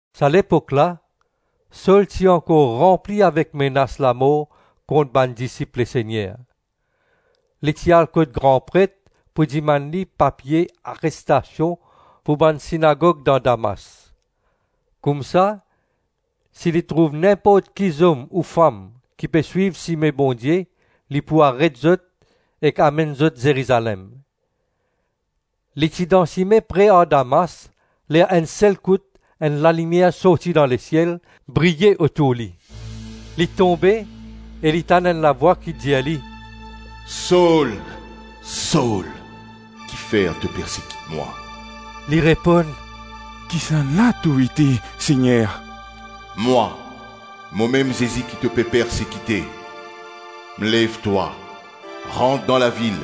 Sa lepok la, Sol ti ankor ranpli avek menas lamor kont bann disip Lesegner. Li ti al kot gran pret pou dimann li papie arestasion pou bann sinagog dan Damas. Koumsa si li trouv ninport ki zom ou fam ki pe swiv Sime Bondie li pou aret zot ek amenn zot Zerizalem. Li ti dan sime pre ar Damas ler enn sel kout enn lalimier sorti dan lesiel, briye otour li. Li tonbe, e li tann enn lavwa ki dir li, “Sol, Sol, kifer to persekit mwa?” Li reponn, “Kisannla to ete, Segner?” “Mwa, momem Zezi ki to pe persekite. Lev twa, rant dan lavil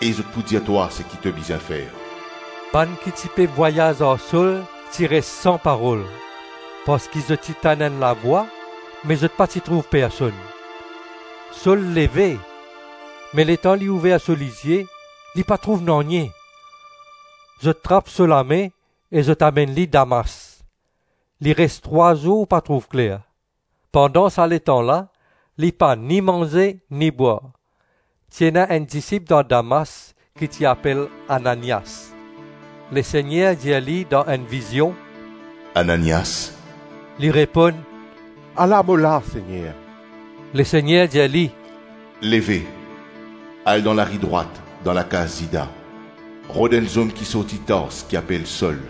e zot pou dir twa seki to bizin fer.” Bann ki ti pe vwayaz ar Sol ti res san parol parski zot ti tann enn lavwa me zot pa ti trouv personn. Sol leve, me letan li ouver so lizie, li pa trouv nanye. Zot trap so lame e zot amenn li Damas. Li res trwa zour pa trouv kler. Pandan sa letan la li pa ni manze ni bwar. Ti ena enn disip dan Damas ki ti apel Ananias. Lesegner dir li dan enn vizion, “Ananias!” Li reponn, “Ala mo la, Segner.” Lesegner dir li, “Leve, al dan lari Drwat, dan lakaz Zida, rod enn zom ki sorti Tars ki apel Sol.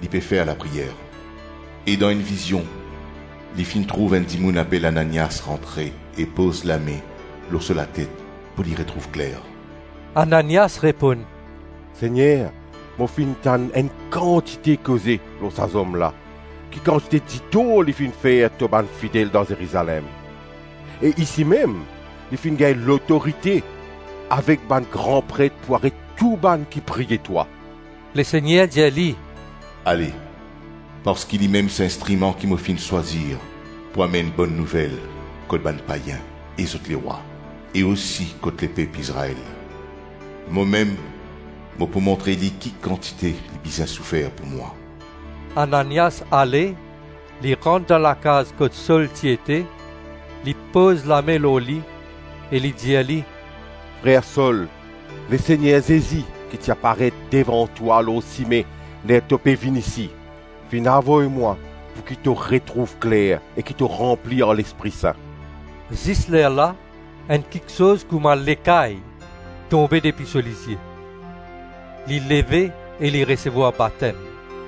Li pe fer lapriyer, e dan enn vizion li finn trouv enn dimoun apel Ananias rantre e poz lame lor so latet pou li retrouv kler.” Ananias reponn, “Segner, mo finn tann enn kantite koze lor sa zom la, ki kantite ditor li finn fer to bann fidel dan Zerizalem. E isi mem, li finn gagn lotorite avek bann gran pret pou aret tou bann ki priye twa.” Lesegner dir li, “Ale, parski limem sa instriman ki mo finn swazir pou amenn Bonn Nouvel kot bann payin e zot lerwa, e osi kot lepep Izrael. Momem mo pou montre li ki kantite li bizin soufer pou mwa.” Ananias ale, li rant dan lakaz kot Sol ti ete, li poz lame lor li e li dir li, “Frer Sol, Lesegner Zezi ki ti aparet devan twa lor sime ler to ti pe vinn isi, finn avoy mwa pouki to retrouv kler e ki to ranpli ar Lespri Sin.” Zis lerla, enn kiksoz kouma lekay tonbe depi so lizie. Li leve e li resevwar batem.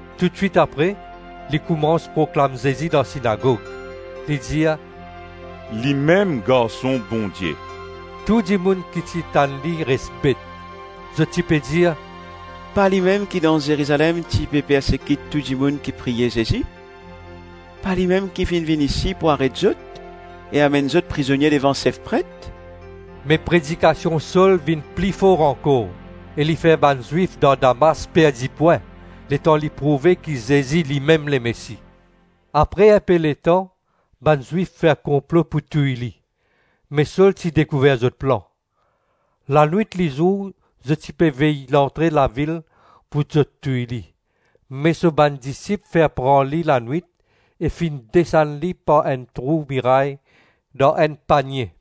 Toutswit apre li koumans proklam Zezi dan sinagog, li dir, “Limem Garson Bondie.” Tou dimoun ki ti tann li ti res bet. Zot ti pe dir, “Pa limem ki dan Zerizalem ti pe persekit tou dimoun ki priye Zezi? Pa limem ki finn vinn isi pou aret zot e amenn zot prizonie devan sef pret?” Me predikasion Sol vinn pli for ankor e li fer bann Zwif dan Damas perdi pwin letan li prouve ki Zezi limem Lemesi. Apre inpe letan bann Zwif fer konplo pou touy li, me Sol ti dekouver zot plan. Lanwit-lizour zot ti pe vey lantre lavil pou zot touy li. Me so bann disip finn pran li lanwit e finn desann li par enn trou miray dan enn panie.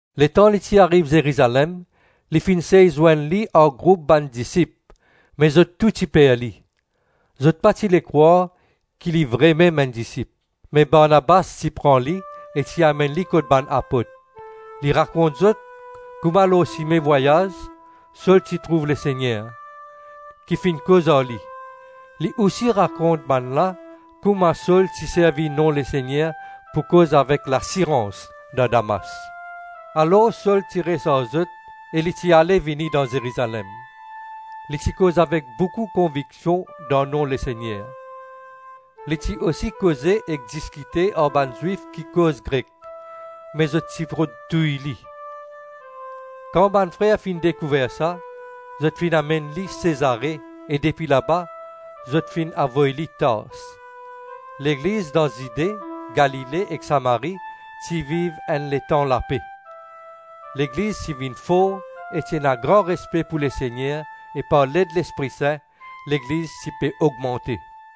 Letan li ti ariv Zerizalem li finn sey zwenn li ar group bann disip me zot tou ti per li. Zot pa ti le krwar ki li vremem enn disip. Me Barnabas ti pran li e ti amenn li kot bann apot. Li rakont zot kouma lor sime vwayaz Sol ti trouv Lesegner, ki finn koz ar li. Li osi rakont bannla kouma Sol ti servi nom Lesegner pou koz avek lasirans dan Damas. Alor Sol ti res ar zot e li ti ale-vini dan Zerizalem. Li ti koz avek boukou konviksion dan nom Lesegner. Li ti osi koze ek diskite ar bann Zwif ki koz Grek, me zot ti rod touy li. Kan bann frer finn dekouver sa, zot finn amenn li Sezare e depi laba zot finn avoy li Tars. Legliz dan Zide, Galile ek Samari ti viv enn letan lape. Legliz ti vinn for e ti ena gran respe pou Lesegner e par led Lespri Sin legliz ti pe ogmante.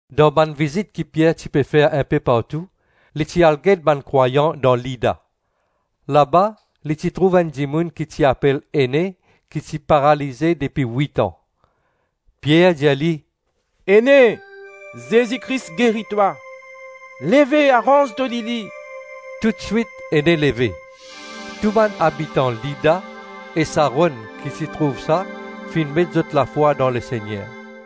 Dan bann vizit ki Pier ti pe fer inpe partou, li ti al get bann krwayan dan Lida. Laba li ti trouv enn dimoun ki ti apel Ene ki ti paralize depi wit-an. Pier dir li, “Ene, Zezi Kris geri twa. Leve, aranz to lili.” Toutswit Ene leve. Tou bann abitan Lida e Saron ki ti trouv sa finn met zot lafwa dan Lesegner.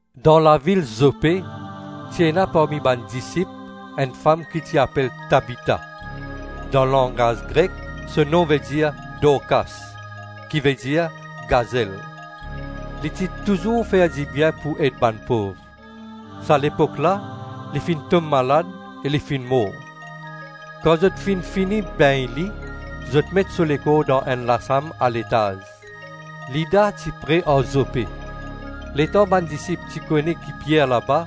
Dan lavil Zope ti ena parmi bann disip enn fam ki ti apel Tabita, dan langaz Grek so nom vedir Dorkas, ki vedir gazel. Li ti touzour fer dibien pou ed bann pov. Sa lepok la li finn tom malad e li finn mor. Kan zot finn fini begn li, zot met so lekor dan enn lasam aletaz. Lida ti pre ar Zope. Letan bann disip ti kone ki Pier laba,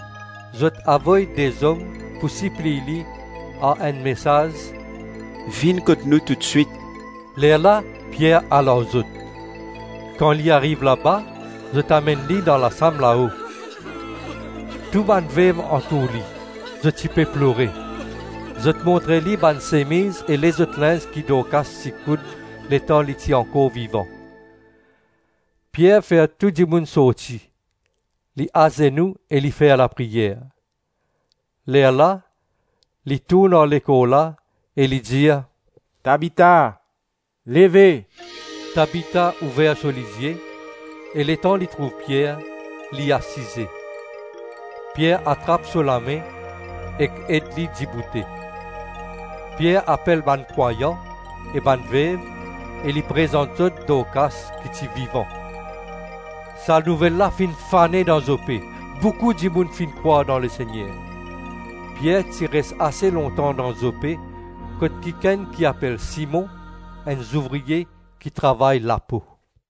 zot avoy de zom pou sipliy li ar enn mesaz, “Vinn kot nou toutswit.” Lerla Pier al ar zot. Kan li ariv laba zot amenn li dan lasam lao. Tou bann vev antour li, zot ti pe plore. Zot montre li bann semiz e lezot linz ki Dorkas ti koud letan li ti ankor vivan. Pier fer tou dimoun sorti, li azenou e li fer lapriyer. Lerla, li tourn ar lekor la e li dir, “Tabita, leve.” Tabita ouver so lizie, e letan li trouv Pier, li asize. Pier atrap so lame ek ed li diboute. Pier apel bann krwayan e bann vev e li prezant zot Dorkas ki ti vivan. Sa nouvel la finn fane dan Zope, boukou dimoun finn krwar dan Lesegner. Pier ti res ase lontan dan Zope kot kikenn ki apel Simon, enn zouvrie ki travay lapo.